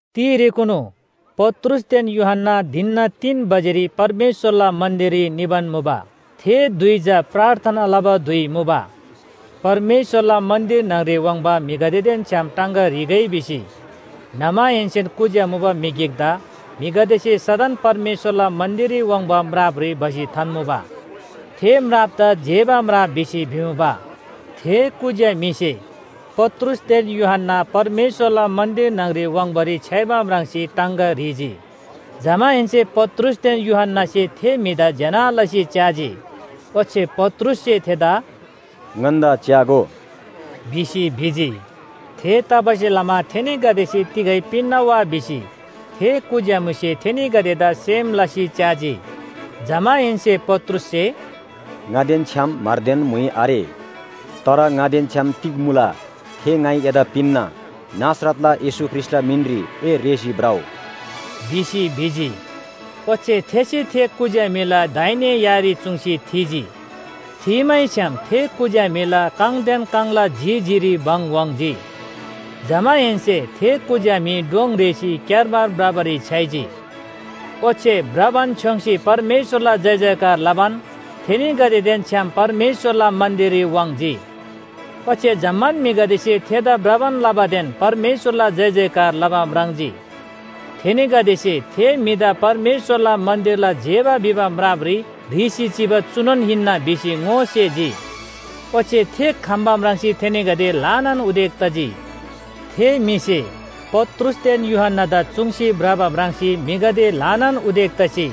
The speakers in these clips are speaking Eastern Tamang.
तिरेकुनु पत्रुसदेन यूहन्‍ना धिनना तीन बजेरी परमेश्‍वरला मन्‍दिररी निबान मुबा। थे धुइ चा प्रार्थना लबा धुइ मुबा। परमेश्‍वरला मन्‍दिर न्‍हङरी वाङ्बा म्‍हिगदेदेन छ्‍याम टाङगा ह्रीगै भिसी न्‍हमाहेन्‍सेन कुज्‍या मुबा म्‍हि गिकदा म्‍हिगदेसे सदन परमेश्‍वरला मन्‍दिररी वाङ्बा म्रापरी भसी थान्‍मुबा। थे म्रापदा जेबा म्राप भिसी भिमुबा। थे कुज्‍या म्‍हिसे पत्रुसदेन यूहन्‍ना परमेश्‍वरला मन्‍दिर न्‍हङरी वाङ्बारी छ्‌याइबा म्राङ्सी टाङगा ह्रीजी। जमाहेन्‍से पत्रुसदेन यूहन्‍नासे थे म्‍हिदा ज्‍यना लसी च्‍याजी, ओच्‍छे पत्रुससे थेदा “ङन्‍दा च्‍यागो” भिसी भिजी। थेतबासेलमा थेनीगदेसे तिगै पिन्‍ना वा भिसी थे कुज्‍या म्‍हिसे थेनीगदेदा सेम लसी च्‍याजी। जमाहेन्‍से पत्रुससे “ङादेन छ्‌याम म्‍हरदेन म्‍हुइ आरे। तर ङादेन छ्‌याम तिग मुला थे ङाइ एदा पिन्‍ना। नासरतला येशू ख्रीष्‍टला मिनरी ए रेःसी भ्रउ!” भिसी भिजी। ओच्‍छे थेसे थे कुज्‍या म्‍हिला दाहिने यारी चुङ्सी थीजी, थीमैछ्‌याम थे कुज्‍या म्‍हिला काङदेन काङला जी जीरी भङ वाङ्‌जी। जमाहेन्‍से थे कुज्‍या म्‍हि डोङ रेःसी क्‍यारमार भ्रबारी छ्‌याइजी। ओच्‍छे भ्रबान छ्‌योङ्‌सी परमेश्‍वरला जयजयकार लबान थेनीगदेदेन छ्‌याम परमेश्‍वरला मन्‍दिररी वाङ्‌जी। ओच्‍छे जम्‍मान म्‍हिगदेसे थेदा भ्रबान लबादेन परमेश्‍वरला जयजयकार लबा म्राङ्जी। थेनीगदेसे थे म्‍हिदा परमेश्‍वरला मन्‍दिरला जेबा भिबा म्रापरी ह्रीसी चिबा चुनोन हिन्‍ना भिसी ङोसेजी। ओच्‍छे थे खम्‍बा म्राङ्सी थेनीगदे ल्‍हानान उदेक तजी। थे म्‍हिसे पत्रुसदेन यूहन्‍नादा चुङ्सी भ्रबा म्राङ्सी म्‍हिगदे ल्‍हानान उदेक तसी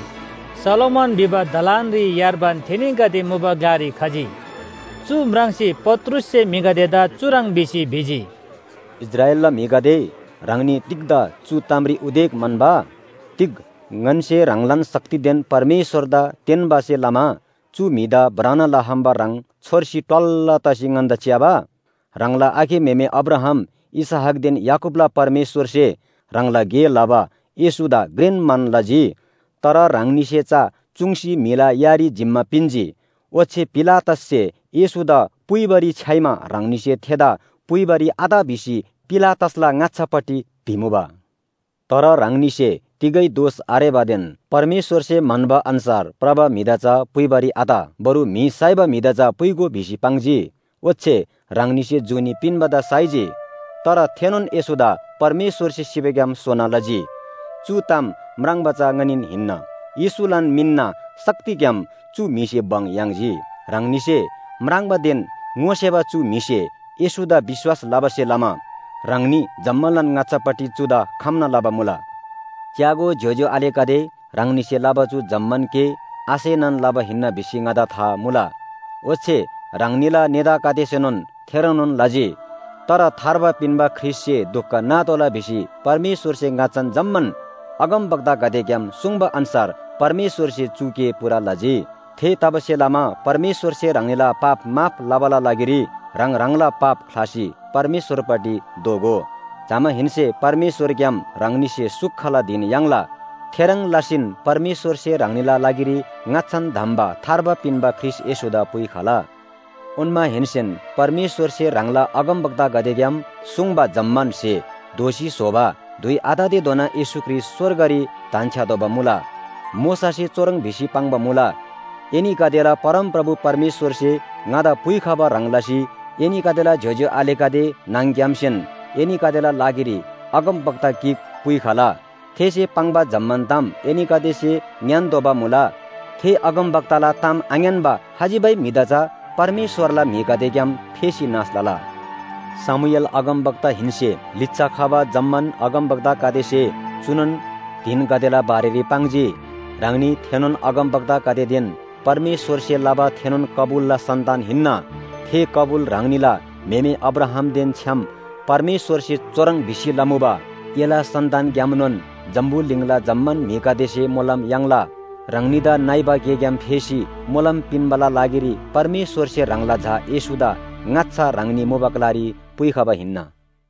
सोलोमन भिबा दलानरी यार्बान थेनीगदे मुबा ग्‍लारी खजी। चु म्राङ्सी पत्रुससे म्‍हिगदेदा चुह्रङ् भिसी भिजी, “इस्राएलला म्‍हिगदे, ह्राङनी तिग्‍दा चु तामरी उदेक म्‍हन्‍बा? तिग ङन्‍से ह्राङलान शक्तिदेन परमेश्‍वरदा तेन्‍बासे लमा चु म्‍हिदा भ्रना लखम्‍बा ह्रङ् छोर्सी ट्‌वल्‍ल तसी ङन्‍दा च्‍याबा? य्‍हाङला आखे म्‍हेमे अब्राहाम, इसहाकदेन याकूबला परमेश्‍वरसे ह्राङला गे लबा येशूदा घ्रेन मान लजी। तर ह्राङनीसे चा चुङ्सी म्‍हिला यारी जिम्‍मा पिन्‍जी, ओच्‍छे पिलातससे येशूदा पुइबारी छ्‌याइमा ह्राङनीसे थेदा पुइबारी आत भिसी पिलातसला ङाच्‍छापट्टि भिमुबा। तर ह्राङनीसे तिगै दोष आरेबादेन परमेश्‍वरसे म्‍हन्‍बा अन्‍छार भ्रबा म्‍हिदा चा पुइबारी आत, बरु म्‍हि साइबा म्‍हिदा चा पुइगो भिसी पाङ्जी। ओच्‍छे ह्राङनीसे जुनी पिन्‍बादा साइजी। तर थेनोन येशूदा परमेश्‍वरसे सिबाग्‍याम सोना लजी, चु ताम म्राङ्बा चा ङनीन हिन्‍ना। येशूलान मिनना शक्तिग्‍याम चु म्‍हिसे भङ याङ्जी। ह्राङनीसे म्राङ्बादेन ङोसेबा चु म्‍हिसे येशूदा विश्‍वास लबासे लमा ह्राङनी जम्‍मालान ङाच्‍छापट्टि चुदा खम्‍ना लबा मुला। “च्‍यागो ज्‍योज्‍यो आलेगदे, ह्राङनीसे लबा चु जम्‍मान गे आसेनान लबा हिन्‍ना भिसी ङादा था मुला। ओच्‍छे ह्राङनीला नेतागदेसेनोन थेह्रङ्नोन लजी। तर थार्बा पिन्‍बा ख्रीष्‍टसे दुख नातोःला भिसी परमेश्‍वरसे ङाच्‍छान जम्‍मान अगमवक्तागदेग्‍याम सुङ्बा अन्‍छार परमेश्‍वरसे चु गे पूरा लजी। थेतबासेलमा परमेश्‍वरसे ह्राङनीला पाप माफ लबाला लागिरी ह्राङ ह्राङला पाप ख्‍लासी परमेश्‍वरपट्टि दोःगो। जमाहेन्‍से परमेश्‍वरग्‍याम ह्राङनीसे सुखला धिन याङ्ला, थेह्रङ् लसीन परमेश्‍वरसे ह्राङनीला लागिरी ङाच्‍छान धम्‍बा थार्बा पिन्‍बा ख्रीष्‍ट येशूदा पुइखला। ओन्‍माहेन्‍सेन परमेश्‍वरसे ह्राङला अगमवक्तागदेग्‍याम सुङ्बा जम्‍मान स्‍हे दोःसी स्‍होबा धुइ आततेधोना येशू ख्रीष्‍ट स्‍वर्गरी धन्‍छ्‌यातोःबा मुला। मोशासे चुह्रङ् भिसी पाङ्बा मुला, ‘एनीगदेला परमप्रभु परमेश्‍वरसे ङादा पुइखबा ह्रङ् लसी एनीगदेला ज्‍योज्‍यो आलेगदे न्‍हङ‌ग्‍यामसेन एनीगदेला लागिरी अगमवक्ता गिक पुइखला। थेसे पाङ्बा जम्‍मान ताम एनीगदेसे ङ्‌यान्‍तोःबा मुला। थे अगमवक्ताला ताम आङ्‌यान्‍बा खजिबै म्‍हिदा चा परमेश्‍वरला म्‍हिगदेग्‍याम फेसी नाश लला।’ “शमूएल अगमवक्ताहेन्‍से लिच्‍छा खबा जम्‍मान अगमवक्तागदेसे चुनोन धिनगदेला बारेरी पाङ्जी। ह्राङनी थेनोन अगमवक्तागदेदेन परमेश्‍वरसे लबा थेनोन कबुलला सन्‍तान हिन्‍ना। थे कबुल ह्राङनीला म्‍हेमे अब्राहामदेन छ्‌याम परमेश्‍वरसे चुह्रङ् भिसी लमुबा, ‘एला सन्‍तानग्‍यामनोन जम्‍बुलिङला जम्‍मान म्‍हिगदेसे मोलम याङ्ला।’ ह्राङनीदा नइबा गेग्‍याम फेसी मोलम पिन्‍बाला लागिरी परमेश्‍वरसे ह्राङला झा येशूदा ङाच्‍छा ह्राङनी मुबा ग्‍लारी पुइखबा हिन्‍ना।”